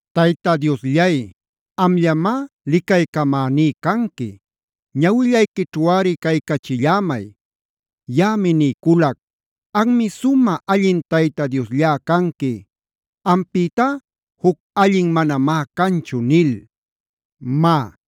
Tayta Diosllay, amllamá licaycamäní canqui. Ñawillayquićhuꞌari caycachillämay. Yaꞌami niyculac: “Anmi sumä allin Tayta Diosllá canqui. Ampïtá juc allin manamá canchu” nil. Má,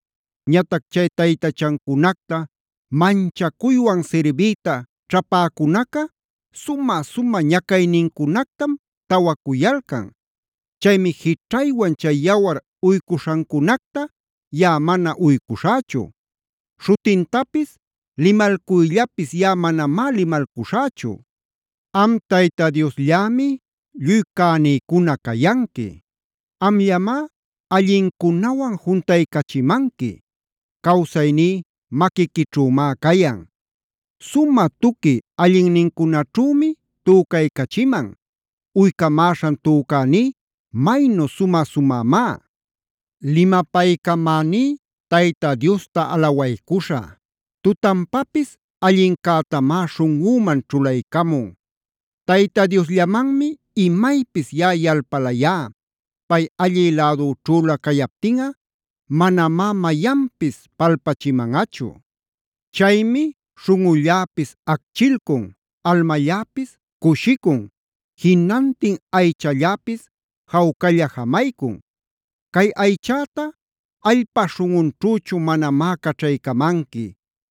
Ñatac chay taytachacunacta manchacuywan sirbiyta ćhapäcunaca sumä-sumä ñacaynincunactam tawacuyalcan. Chaymi jićhaywan chay yawar uycuśhancunacta yaꞌa mana uycuśhächu. Śhutintapis limalcuyllapis yaꞌa manamá limalcuśhächu. Am Tayta Diosllämi lluy cänïcuna cayanqui; amllamá allincunawan juntaycachimanqui. Cawsayní maquiquićhümá cayan. Sumä tuqui allinnincunaćhümi tücaycachiman. Uycamäśhan tücäní maynu sumä-sumämá. Limapaycamäní Tayta Diosta alawaycuśhä. Tutanpapis allincätamá śhunꞌüman ćhulaycamun. Tayta Diosllamanmi imaypis yaꞌa yalpalayá. Pay allï lädüćhülä cayaptinꞌa manamá mayanpis palpachimanꞌachu. Chaymi śhunꞌulläpis acchilcun, almalläpis cushicun, jinantin aychalläpis jawcalla jamaycun. Cay aychäta allpa śhunꞌunćhüchu manamá caćhaycamanqui.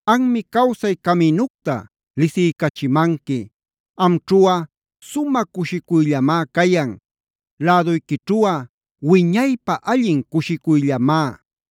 Anmi cawsay caminucta lisiycachimanqui. Amćhuꞌa sumä cushicuyllamá cayan.d Läduyquićhuꞌa wiñaypä allin cushicuyllamá.